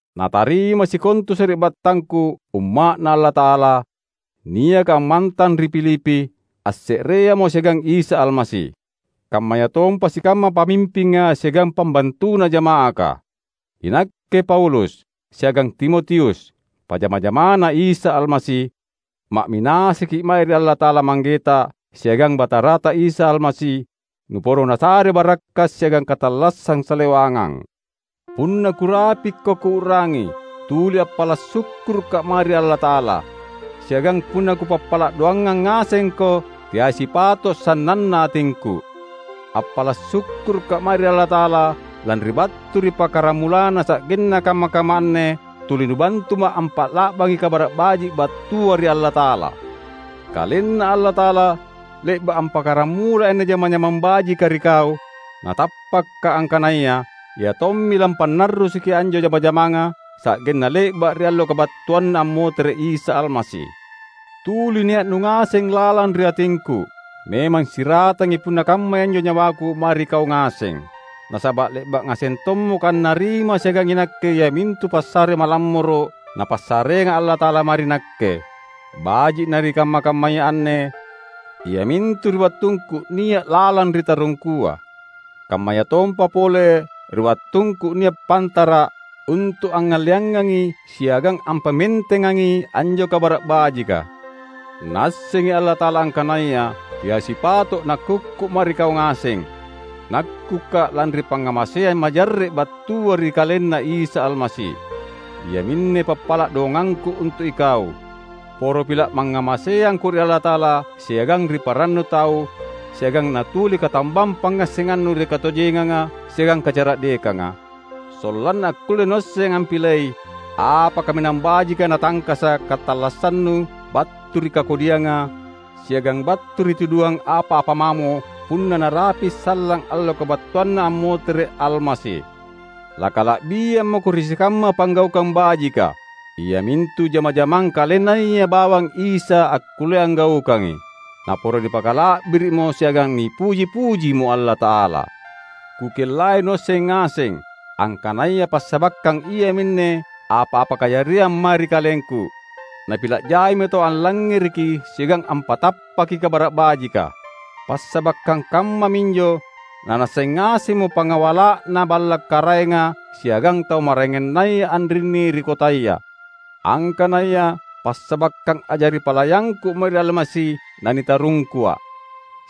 Natarimai sikontu sari’battangku umma’Na Allata’ala, niaka ammantang ri Filipi, asse’reamo siagang Isa Almasi. Kammayatompa sikamma pamimpinga siagang pambantuna jama’aka! Inakke Paulus, siagang Timotius, pajama-jamaNa Isa Almasi; ma’minasaki’ mae ri Allata’ala Manggeta siagang Batarata Isa Almasi, nuporo Nasare barakka’ siagang katallassang salewangang. Punna kurapikko kuu’rangi, tuli appala’ sukkuruka’ mae ri Allata’ala. Siagang punna kupappala’ doangang ngasengko, teai sipato’ sannanna atingku. Appala’ sukkuruka’ mae ri Allata’ala lanri battu ri pakkaramulanna sa’genna kamma-kamma anne, tuli nubantuma’ ampa’la’bangi Kabara’ Baji’ battua ri Allata’ala. KalenNa Allata’ala le’ba’ ampakaramulai anne jama-jamang bajika ri kau; na tappaka’ angkanaya Ia tommi lampannarrusuki anjo jama-jamanga sa’genna le’ba’ ri Allo kabattuanNa ammotere’ Isa Almasi. Tuli nia’nu ngaseng lalang ri atingku. Memang siratangi punna kammai anjo nyawaku mae ri kau ngaseng. Nasaba’ le’ba’ ngaseng tommako annarima siagang inakke iamintu passare malammoro’ Napassareanga Allata’ala mae ri nakke; baji’ na ri kamma-kammaya anne, iamintu ri wattungku nia’ lalang ri tarungkua, kammayatompa pole ri wattungku nia’ pantara’ untu’ angngalleangangi siagang ampamentengangi anjo Kabara’ Bajika. Naassengi Allata’ala angkanaya teai sipato’ nakkukku mae ri kau ngaseng; nakkuka’ lanri pangngamaseang majarre’ battua ri KalenNa Isa Almasi. Iaminne pappala’ doangangku untu’ ikau: poro pila’ mangngamaseangko ri Allata’ala siagang ri parannu tau siagang natuli katambang pangngassengannu ri katojenganga siagang kacara’dekanga, sollanna akkulle nuasseng ampilei apa kaminang bajika natangkasa’ katallassannu battu ri kakodianga siagang battu ri tuduhang apa-apa mamo punna narapi’ sallang allo kabattuanNa ammotere’ Almasi. Lakala’biang mako ri sikamma panggaukang bajika; iamintu jama-jamang KalenNaya bawang Isa akkulle anggaukangi; naporo nipakala’biri’mo siagang nipuji-pujimo Allata’ala. Kukellai nuasseng ngaseng, angkanaya passabakkang iaminne apa-apa kajariang mae ri kalengku, napila’ jaimo tau allangngereki siagang ampatappaki Kabara’ Bajika. Passabakkang kammaminjo nanaasseng ngasemmo pangawala’na balla’ karaenga siagang tau maraengannaya anrinni ri kotaya, angkanaya passabakkang a’jari palayangku mae ri Almasi nanitarungkua’.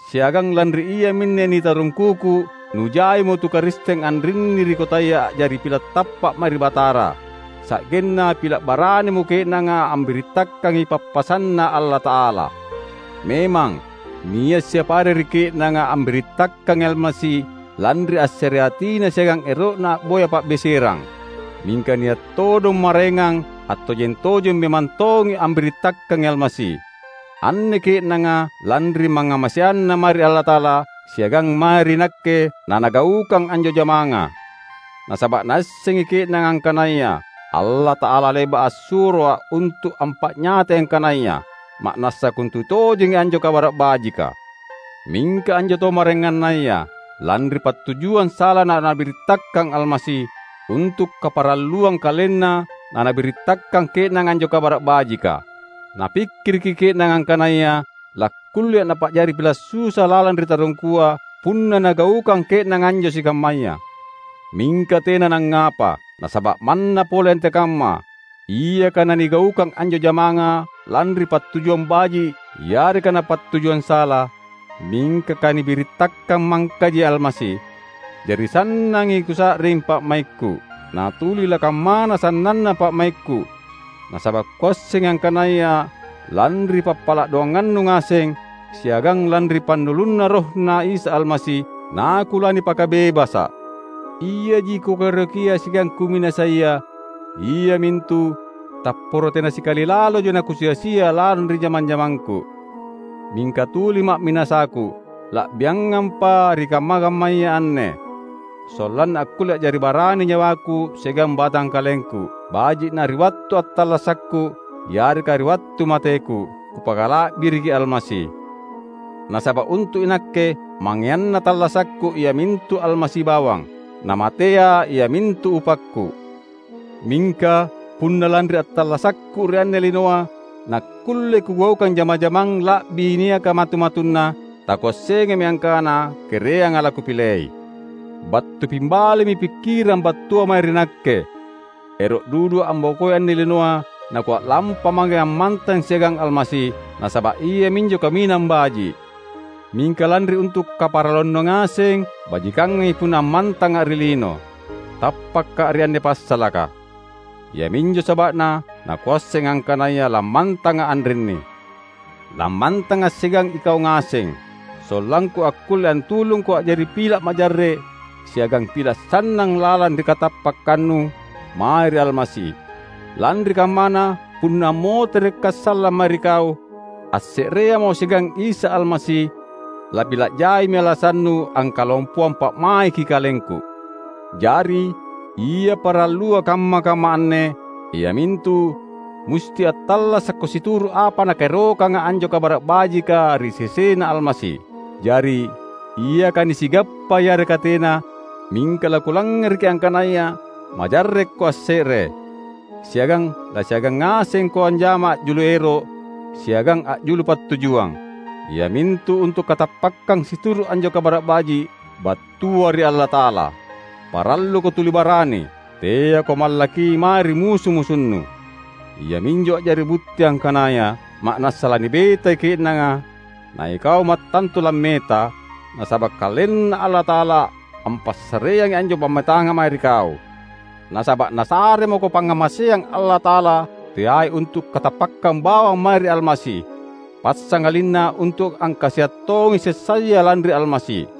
Siagang lanri iaminne nitarungkuku nujaimo tu Karisteng anrinni ri kotaya a’jari pila’ tappa’ mae ri Batara; sa’genna pila’ baranimo ke’nanga ambirittakangi pappasanNa Allata’ala. Memang, nia’ siapa are ri ke’nanga ambirittakangi Almasi lanri assereatina siagang ero’na a’boya pa’beserang; mingka nia’ todong maraengang attojeng-tojeng memang tongi ambirittakangi Almasi. Anne ke’nanga, lanri mangngamaseanna mae ri Allata’ala siagang mae ri nakke nanagaukang anjo jamanga; nasaba’ naassengi ke’nanga angkanaya Allata’ala le’ba’ assuroa’ untu’ ampa’nyatai angkanaya ma’nassa kontutojengi anjo Kabara’ Bajika. Mingka anjo tau maraengannaya, lanri pattujuang sala nanabirittakang Almasi; untu’ kaparalluang kalenna nanabirittakang ke’nanga anjo Kabara’ Bajika. Napikkiriki ke’nanga angkanaya lakkullea’ napa’jari pila’ susa lalang ri tarungkua punna nagaukang ke’nanga anjo sikammaya. Mingka tena nangngapa! Nasaba’ manna pole antekamma, iaka nanigaukang anjo jamanga lanri pattujuang baji’ yareka napattujuang sala, mingka kanibirittakang mangkaji Almasi; jari, sannangi kusa’ring pa’maikku. Na tuli lakammana sannanna pa’maikku; nasaba’ kuassengi angkanaya lanri pappala’ doangannu ngaseng, siagang lanri pannulunNa RohNa Isa Almasi, nakulanipakabebasa’. Iaji kukaerokia siagang kuminasaia, iamintu: tapporo tena sikali laloja nakusia-sia lalang ri jama-jamangku. Mingka tuli ma’minasaku, la’biangampa ri kamma-kammaya anne, sollanna akkulle a’jari barani nyawaku siagang batangkalengku — baji’ na ri wattu attallasakku yareka ri wattu mateku — kupakala’biriki Almasi. Nasaba’ untu’ inakke, mangeanna tallassakku iamintu Almasi bawang! Na matea iamintu upakku. Mingka, punna lanri attallasakku ri anne linoa nakkulle kugaukang jama-jamang la’bi niaka matu-matunna, takuassengami angkana kereanga lakupilei. Battu pimbalimi pikkirang battua mae ri nakke. Ero’ dudua’ ambokoi anne linoa nakua’lampa mange ammantang siagang Almasi, nasaba’ iaminjo kaminang baji’. Mingka lanri untu’ kaparalluannu ngaseng, bajikangangi punna ammantanga’ ri lino. Tappaka’ ri anne passalaka. Iaminjo saba’na nakuasseng angkanaya lammantanga’ anrinni. Lammantanga’ siagang ikau ngaseng, sollangku akkulle antulungko a’jari pila’ majarre’ siagang pila’ sannang lalang ri katappakkannu mae ri Almasi. Lanri kammana, punna ammoterekka’ sallang mae ri kau, asse’reamo siagang Isa Almasi, lapila’ jaimi alasannu angkalompoang pa’maiki kalengku. Jari, ia parallua kamma-kamma anne, iamintu musti attallasakko situru’ apa nakaerokanga anjo Kabara’ Bajika ri sesena Almasi. Jari, iaka nisigappa yareka tena, mingka lakulangngereki angkanaya majarrekko asse’re, siagang lasiagang ngasengko anjama a’julu ero’ siagang a’julu pattujuang; iamintu untu’ katappakkang situru’ anjo Kabara’ Baji’ battua ri Allata’ala. Paralluko tuli barani; teako mallaki mae ri musu-musunnu. Iaminjo a’jari butti angkanaya ma’nassa lanibetai ke’nanga, na ikau mattantu lammeta, nasaba’ KalenNa Allata’ala ampassareangi anjo pammetanga mae ri kau. Nasaba’ Nasare mako pangngamaseang Allata’ala teai untu’ katappakkang bawang mae ri Almasi, passangalinna untu’ angkasia’ tongi sessaya lanri Almasi.